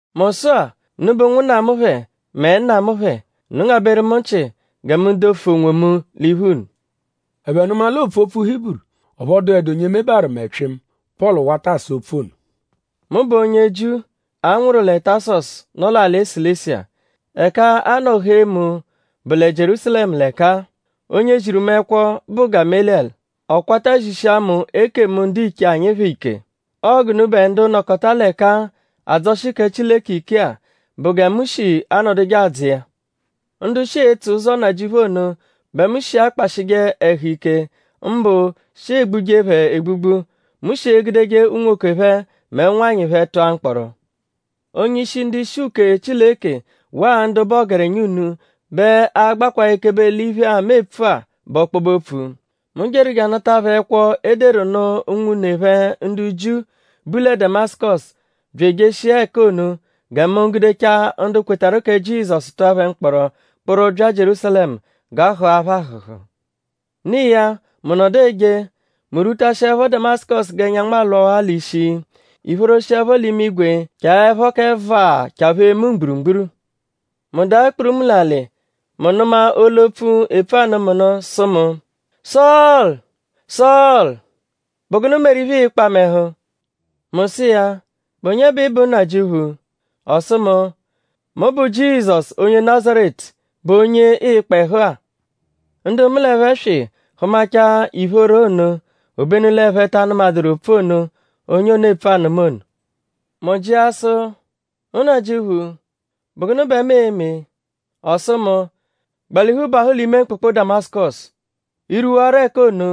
“Mu sụ-a; unubẹ ụnwunna mu phẹ; mẹ nna mu phẹ! Unu ngabẹru mu nchị gẹ mu dofu onwomu l'iphu unu!” Ẹphe nụma l'oopfu opfu Hiburu; ọphu ọ dụedu onye mebaru mẹ pyịmu. Pọlu wata asa opfu ono. “Mu bụ onye Jiu, a nwụru lẹ Tasọsu, nọ l'alị Silisiya. Ẹka a nọ hee mu bụ lẹ Jierúsalẹmu l'ẹka-a. Onye ziru mu ẹkwo bụ Gameliyẹlu. Ọ kwata zishia mu ekemu ndiche anyi phẹ ike. Ọo g'unubẹ ndu nọkota l'ẹka-a adzọshi kẹ Chileke ike-a bụ gẹ mu shi anọduje adzọ iya. Ndu shi etso Ụzo Nnajịuphu ono bẹ mu shi akpashịje ẹhu ike; mbụ shi egbuje phẹ egbugbu. Mu shi egudeje unwoke phẹ mẹ ụnwanyi phẹ tụa mkpọro. Onye-ishi ndu-ishi uke Chileke waa ndu bụ ọgerenya unu bẹ a-gbakwaa ekebe l'iphe-a, mu epfu-a bụ ọkpobe-opfu. Mu jeru je anata phẹ ẹkwo, e deru nụ unwune phẹ ndu Jiu, bu lẹ Damasụkosu bya ejeshia ẹka ono gẹ mu gudechaa ndu kwetarụ kẹ Jizọsu tụa phẹ mkpọro kpụru bya Jierúsalẹmu g'a hụa phẹ ahụ̀hù. “No iya; mu nọdu eje; mu rwutashịepho Damasụkosu g'ẹnyanwu alwawaa l'ishi; ìphóró shiẹpho l'imigwe chaẹpho kẹ vaa chaphee mu mgburugburu. Mu daa kpurumu l'alị. Mu nụma olu-opfu, epfu anụ mu nụ sụ mu: ‘Sọlu! Sọlu!?Bụ gụnu meru iphe, ịikpa mu ẹhu?’ Mu sụ iya: ‘?Bụ onye bẹ ị bụ Nnajịuphu?’ Ọ sụ mu: ‘Mu bụ Jizọsu onye Nazaretu, bụ onye ịikpa ẹhu-a.’ Ndu mu l'ẹphe swị hụmachaa ìphóró ono obenu l'ẹphe ta anụmaduru opfu ono, onye ono epfu anụ mu ono. Mu jịa sụ: ‘Nnajịuphu;?bụ gụnu bẹ mu e-me?’ Ọ sụ mu: ‘Gbalihu bahụ l'ime mkpụkpu Damasụkosu. I -rwuwarọ ẹka ono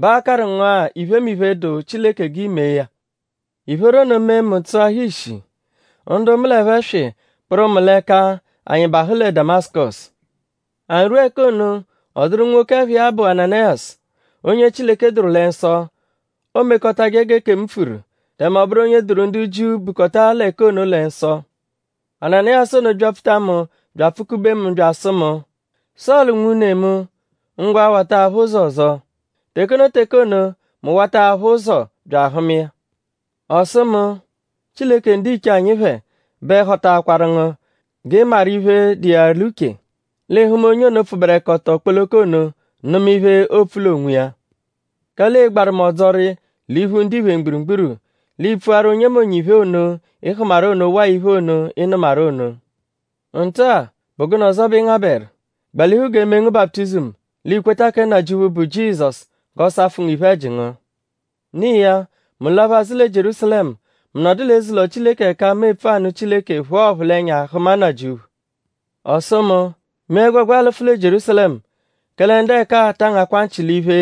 bẹ aa-karụ ngu-a iphemiphe, dụ Chileke g'i mee ya.’ Ìphóró ono mee mu tsụahaa ishi. Ndu mu l'ẹphe swị kpụru mu l'ẹka anyi bahụ lẹ Damasụkosu. “Anyi rwua ẹka ono; ọ dụru nwoke, ẹpha iya bụ Ananayasu: onye Chileke dụru lẹ nsọ. Oomekọtaje g'ekemu pfuru; tẹme ọ bụru onye dụru ndu Jiu, bukọta l'ẹka ono lẹ nsọ. Ananayasu ono byapfuta mu bya apfụ-kube mu bya asụ mu: ‘Sọlu nwune mu; ngwa wata aphụ ụzo ọzo!’ Teke ono teke ono mu wata aphụ ụzo bya ahụma iya. Ọ sụ mu: ‘Chileke ndiche anyi phẹ bẹ họtaakwaru ngu g'ị maru iphe, dụ iya l'uche; l'ị hụma onye ono, pfụberekoto kpoloko ono; nụma iphe, oopfu l'onwiya. Kẹle ịi-gbaru mu ọdzori l'iphu ndiphe mgburugburu. L'i pfuaru onyemonye iphe ono, ị hụmaru ono waa iphe ono, ị nụmaru ono. Nta-a;?bụ gụnu ọzo bẹ ị ngabẹru? Gbalihu g'e mee ngu baputizimu; l'i kweta kẹ Nnajịuphu, bụ Jizọsu g'ọ safụ ngu iphe-ẹji ngu.’” “No iya; mu laphu azụ lẹ Jierúsalẹmu. Mu nọdu l'eze-ụlo Chileke ẹka mu epfu anụ Chileke phụa ọphulenya hụma Nnajịuphu. Ọ sụ mu: ‘Mee ẹgwegwa lụfu lẹ Jierúsalẹmu; kẹle ndu ẹka-a taa ngakwa nchị l'iphe,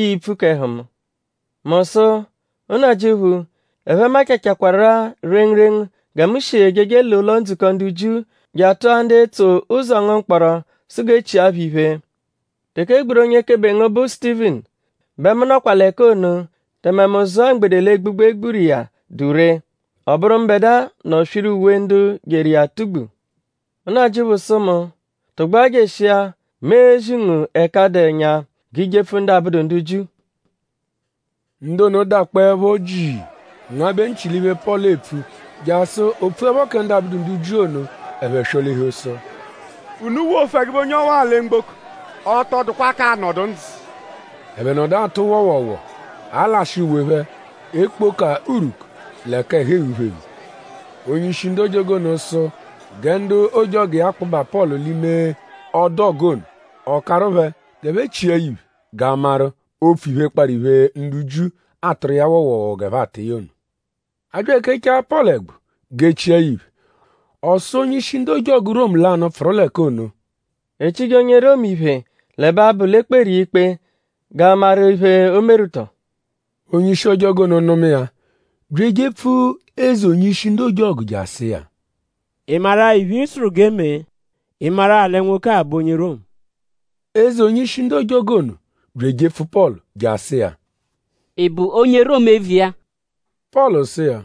ii-pfu k'ẹhu mu.’ Mu sụ: ‘Nnajịuphu; ẹphe machachakwaru-a rengurengu gẹ mu shi ejeje l'ụlo-ndzukọ ndu Jiu je atụa ndu etso ụzo ngu mkpọro sụ g'e chia phẹ iphe. Teke e gburu onye-ekebe ngu bụ Sutivinu; bẹ mu nọkwa l'ẹka ono; tẹme mu zụa mgbede l'egbugbu, e gburu iya dụ ree. Ọ bụru mbẹdua nọ swiru uwe ndu jeru iya atugbu.’ Nnajịuphu sụ mu: Tụgbua jeshia! Mu e-zi ngu ẹka dụ ẹnya g'i jepfu ndu abụdu ndu Jiu.” “Ndu ono dakpọepho jii ngabẹ nchị l'iphe, Pọlu epfu jasụ o pfuẹpho kẹ ndu abụdu ndu Jiu ono; ẹphe swọ-lihu sụ: Unu wofu ẹgube onye ọwa-a lẹ mgboko! Ọ tọ dụkwa k'anọdu ndzụ!” Ẹphe nọdu atụ wọowoowoo; alashị uwe phẹ; ekpoka urwuku; l'ẹka ẹhu eghu phẹ eghu. Onye-ishi ndu ojọgu ono sụ gẹ ndu ojọgu iya kpụba Pọlu l'ime ọdu ọgu ono. Ọ karụ phẹ g'ẹphe chia ya iphe g'a maru oo-pfu iphe, kparụ iphe, ndu Jiu atụru iya woowoowoo g'ẹphe atụ iya ono. A bya ekechaa Pọlu ẹgbu g'e chia ya iphe; ọ sụ onye-ishi ojọgu ndu Romu lanụ, pfụru l'ẹka ono: “?E chije onye Romu iphe l'ẹbe abụ l'e kperu iya ikpe g'a maru iphe, o meru tọo?” Onye-ishi ojọgu ono nụma iya bya ejepfu eze onye-ishi ndu ojọgu je asụ iya: “?Ị maru-a iphe, ị sụru g'e mee??Ị maru-a lẹ nwoke-a bụ onye Romu?” Eze onye-ishi ndu ojọgu ono bya ejepfu Pọlu je asụ iya: “?Ị bụ onye Romu eviya?” Pọlu sụ iya: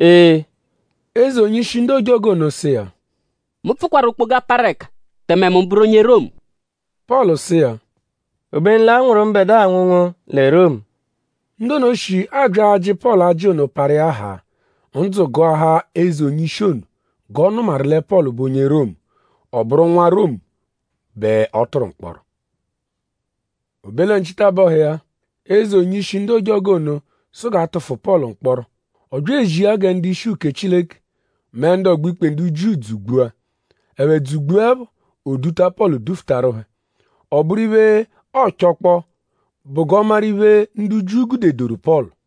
“Ee.” Eze onye-ishi ndu ojọgu ono sụ iya: Mu pfụkwaru okpoga, parụ ẹka; tẹme mu bụru onye Romu. Pọlu sụ iya: Obenu l'a nwụru mbẹdua anwụnwu lẹ Romu. Ndu ono shi abya ajị Pọlu ajị ono parụ iya haa. Ndzụ gụahaa eze onye-ishi ono g'ọ nụmaru lẹ Pọlu bụ onye Romu. Ọ bụru nwa Romu bẹ ọ tụru mkpọro. O be lẹ nchitabọhu iya; Eze onye-ishi ndu ojọgu ono sụ g'a tụfu Pọlu mkpọro. Ọ bya ezia gẹ ndu-ishi uke Chileke mẹ ndu ọgbo-ikpe ndu Jiu dzugbua. Ẹphe dzugbuẹpho; o duta Pọlu dufutarụ phẹ. Ọ bụru iphe, ọochokpoo bụ g'ọ maru iphe, ndu Jiu gudedoru Pọlu.